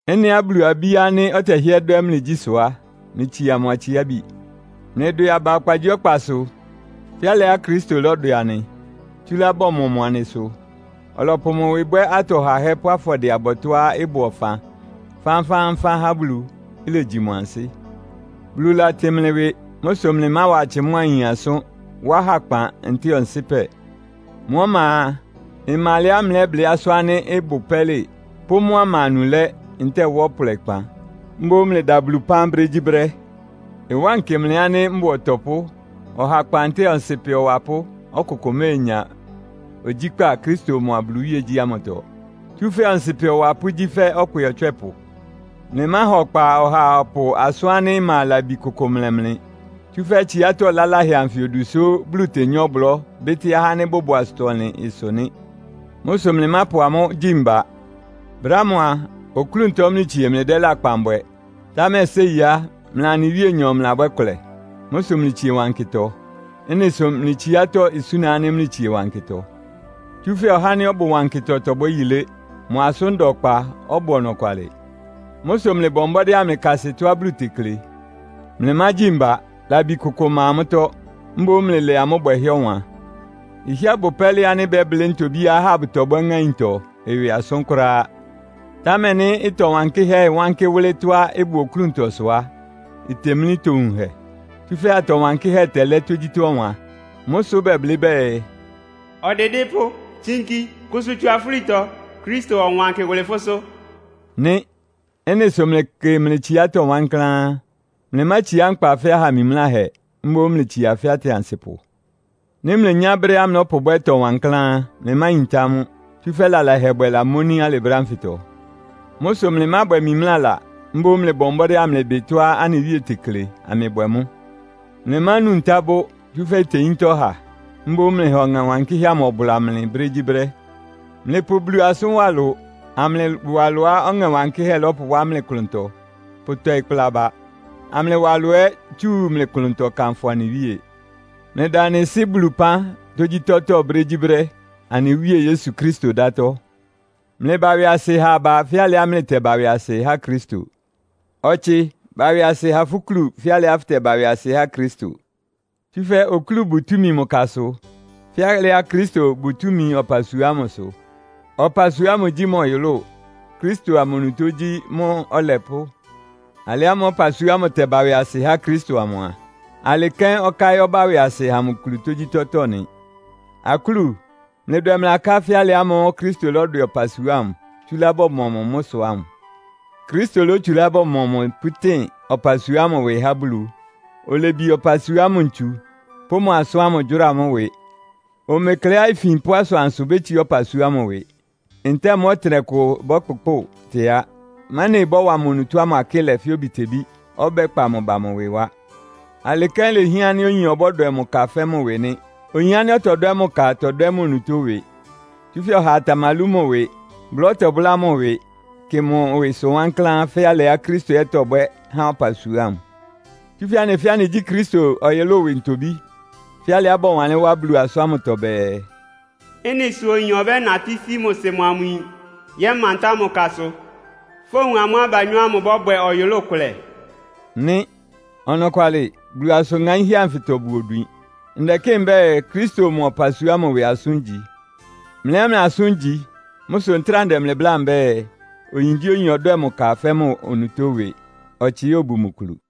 Ɩ́nɩá Bulu abí ánɩ́ ɔtɛhɩ́ɛ́ dwɛ́ mlɩgyí sʋ á, mlɩtsia mʋ atsiábi. Mlɩdwɛ aba ɔkpagyíɔkpasʋ, fɛ́ alɩá Kristo lɔ́dwɛ anɩ, tsúlá bɔmɔ mʋ anɩ sʋ. Ɔlɔpʋ mʋ ɩwɩ bwɛ́ atɔ hahɛ́ pʋ́ afɔdɩɛ-abɔtɔ́á ɩbʋ ɔfan fánfáánfán há Bulu, ilegyi mʋ ansɩ́. Bulu latɩn mlɩ ɩwɩ. Mʋ́ sʋ mlɩmáwa atsɩ mʋ́a ayin asʋ́n, wá hakpan, ntɛ́ɛ ɔnsɩ́pɛ. Mʋ́ ɔma a, ɩma alɛá mlɛ́blɩ́ asʋ́n ánɩ́ ɩbʋ pɛ́lɩ pʋ́ mʋ́á ɩma anulɛ́, ntɛ́ɛ wá ɔplɔɩkpan. Mboún mlɩda Bulu ɩpán brégyíbrɛ́. Ɩwánkɩ mlɩ ánɩ́ mbʋa ɔtɔpʋ́, ɔhakpan ntɛ́ɛ ɔnsɩ́pɛ ɔwapʋ́ ɔkʋkʋ méenya ogyíkpá Kristo mʋa Bulu iwíegyí ámʋtɔ. (Tsúfɛ́ ɔnsɩ́pɛ ɔwapʋ́ gyí fɛ́ ɔkpɩ ɔtswɛ́pʋ). Mlɩmáha ɔkpa ɔhaa ɔpʋ́ʋ asʋ́n ánɩ́ ɩma labi kʋkʋ mlɛ́ mlɩ. Tsúfɛ́ tsiátɔ́ laláhɛ anfɩ odu sʋ́ Bulu tenyá ɔblɔ́ bɩ́tɩ́ ahá ánɩ́ bʋbʋ asʋtɔ-ɔnlɩn ɩsʋ nɩ́. Mʋ́ sʋ mlɩmápʋ amʋ́ gyi mba. Brɛ́ ámʋ a, oklúntɔ mlɩtsie mlɩdɛ́ lakpan bwɛ, támɛ séi á, mlɩa anɩ Wíenyɔ mlɩlabwɛ́ ɩkʋlɛ. Mʋ́ sʋ mlɩtsie wankɩtɔ. Ɩ́nɩ sʋ mlɩ tsiátɔ́ isúna ánɩ́ mlɩtsie wankɩtɔ. Tsúfɛ́ ɔhá ánɩ́ ɔbʋ wankɩtɔ tɔbwɛ́ yilé. Mʋ asʋ́n da ɔkpa, ɔbʋ ɔnɔkwalɩ. Mʋ́ sʋ mlɩbɔ mbɔ́dɩ́ amlɩkasɩ tɔ́á Bulu tekle. Mlɩmágyi mba. Labi kʋkʋ ɩma mʋ́tɔ́. Mboún mlɩlɛ amʋ́ bwɛhɛ́ ɔwan. Ɩhɩ́ɛ́ bʋ pɛ́lɩ ánɩ́ bɛ́blɩ́ ntobíá ahá bʋtɔbwɛ́ ŋáintɔ ɩwɩ asʋ́n kʋ́ráá. Támɛ nɩ́ ɩtɔ wankɩ́hɛ́ ɩwánkɩ́ wʋ́lɩ́ tɔ́á ɩbʋ oklúntɔsʋ á, itemlí itowunhɛ. Tsúfɛ́ atɔ wankɩ́hɛ́ tɛlɛ́ tógyítɔ́ ɔwan. Mʋ́ sʋ́ bɛblɩ́ bɛɛ, “Ɔdɩdɩ́pʋ́, tsinki. Kʋsʋ tsu afúlitɔ, Kristo ɔwankɩ wʋlɩ fʋ́sʋ́.” nɩ. Ɩ́nɩ sʋ mlɩkɩ mlɩ tsiátɔ́ wankláán. Mlɩmátsiá nkpa fɛ́ aha mimláhɛ, mboún mlɩtsia fɛ́ atɩansɩpʋ. Nɩ́ mlenyá brɛ́á mlɔ́pʋbwɛ́ ɩtɔ wankláán á, mlɩmáyintá mʋ́. Tsúfɛ́ lalahɛbwɛ lamóní alɩ brɛ́ ánfɩtɔ. Mʋ́ sʋ mlɩmábwɛ mimlála. Mboún mlɩbɔ mbɔ́dɩ́ amlɩbɩ tɔ́á anɩ Wíe tekle, amlɩbwɛ mʋ́. Mlɩmánu ntá bʋ́, tsúfɛ́ iteyíntá ɔha. Mboún mlɩha Ɔŋɛ́ Wankɩ́hɛ́ amʋ ɔbʋla mlɩ brégyíbrɛ́. Mlɩpʋ Bulu asʋ́n wá ɩlʋ, amlɩwa ɩlʋá Ɔŋɛ Wankɩ́hɛ́ lɔ́pʋwá mlɩ klʋntɔ pʋtɔɩ kpla aba; amlɩwa ɩlʋ ɛ́ tsu mlɩ klʋntɔ kanfʋ anɩ Wíe. Mlɩda anɩ Sɩ́ Bulu ɩpán tógyítɔ́tɔ́ brégyíbrɛ́, anɩ Wíe Yesu Kristo ɩdátɔ́. Mlɩba ɩwɩasɩ ha aba fɛ́ alɩá mlɩtɛba ɩwɩasɩ há Kristo. Ɔtsɩ, ba ɩwɩasɩ ha fʋ́ kúlu fɛ́ alɩá fʋtɛba ɩwɩasɩ há Kristo. Tsúfɛ́ okúlu bʋ túmi mʋ kasʋ, fɛ́ alɩá Kristo bʋ túmi ɔpasua ámʋsʋ. Ɔpasua ámʋ gyí mʋ ɔyʋlʋ́ʋ, Kristo amʋ onutó gyí mʋ́ Ɔlɛpʋ́. Alɩ ámʋ́ʋ́ ɔpasua ámʋ tɛba ɩwɩasɩ há Kristo amʋ a, alɩ́ kɛ́n ɔká ɛ́ ɔbá ɩwɩasɩ ha mʋ kulu tógyítɔ́tɔ́ nɩ. Akúlu, mlɩdwɛ mlɩ aká fɛ́ alɩ ámʋ́ʋ́ Kristo lɔ́dwɛ ɔpasua ámʋ, tsúlá bɔmɔ mʋ mʋ́ sʋ ámʋ. Kristo lótsulá bɔmɔ mʋ pʋ́tɩn ɔpasua ámʋ ɩwɩ há Bulu. Olebie ɔpasua ámʋ ntsu, pʋ́ mʋ asʋ́n ámʋ gyʋ́ra mʋ́ ɩwɩ. Omekleá ifin pʋ́ asʋansʋ bétsiá ɔpasua ámʋ ɩwɩ, ntɛ́ɛ mʋ́ ɔtɩnɛkʋ ɩbɔ́kpʋkpʋ́ʋ tɩá, mɛ́nɩ ɩbɔ́wa mʋ onutó ámʋ akɩ́lɛ fɛ́ obitebí, ɔbɛ́kpa mʋ ba mʋ ɩwɩ wá. Alɩ kɛ́n lehián ánɩ́ oyin ɔbɔ́dwɛ mʋ ka fɛ́ mʋ ɩwɩ nɩ́. Oyin ánɩ́ ɔtɔdwɛ́ mʋ ka tɔdwɛ́ mʋ onutó ɩwɩ. Tsúfɛ́ ɔhaa tamalú mʋ ɩwɩ, bʋlá ɔtɛbʋ́lá mʋ ɩwɩ, kɩ mʋ ɩwɩsʋ wankláán fɛ́ alɩá Kristo ɛ́ tɔbwɛ́ há ɔpasua ámʋ. Tsúfɛ́ anɩ fɛ́ɛ́ anɩgyí Kristo ɔyʋlʋ́ʋ ɩwɩ ntobí. Fɛ́ alɩá bɔwanlɩ́n wá Bulu asʋ́n ámʋtɔ bɛɛ, “Ɩ́nɩ sʋ oyin ɔbɛ́natɩ́ sí mʋ sɩ mʋa mʋ yin, yɛ́mantá mʋ kasʋ. Fówun amʋ́ abanyɔ́ ámʋ bɔ́bwɛ ɔyʋlʋ́ʋ kʋlɛ” nɩ. Ɔnɔkwalɩ, Bulu asʋ́n ŋaínhɛ́ anfɩtɔ bʋ odwin. Ndɛkɩ́ɩ mbɛ́ɛ, Kristo mʋa ɔpasua ámʋ ɩwɩ asʋ́n igyi. Mlɩ ɛ́ mlɩ asʋ́n igyi. Mʋ́ sʋ ntráa ndɛ mlɩ bláa mbɛ́ɛ, oyingyíoyin ɔdwɛ́ɛ mʋ ka fɛ́ mʋ onutó ɩwɩ, ɔtsɩ ɛ́ obu mʋ kulu.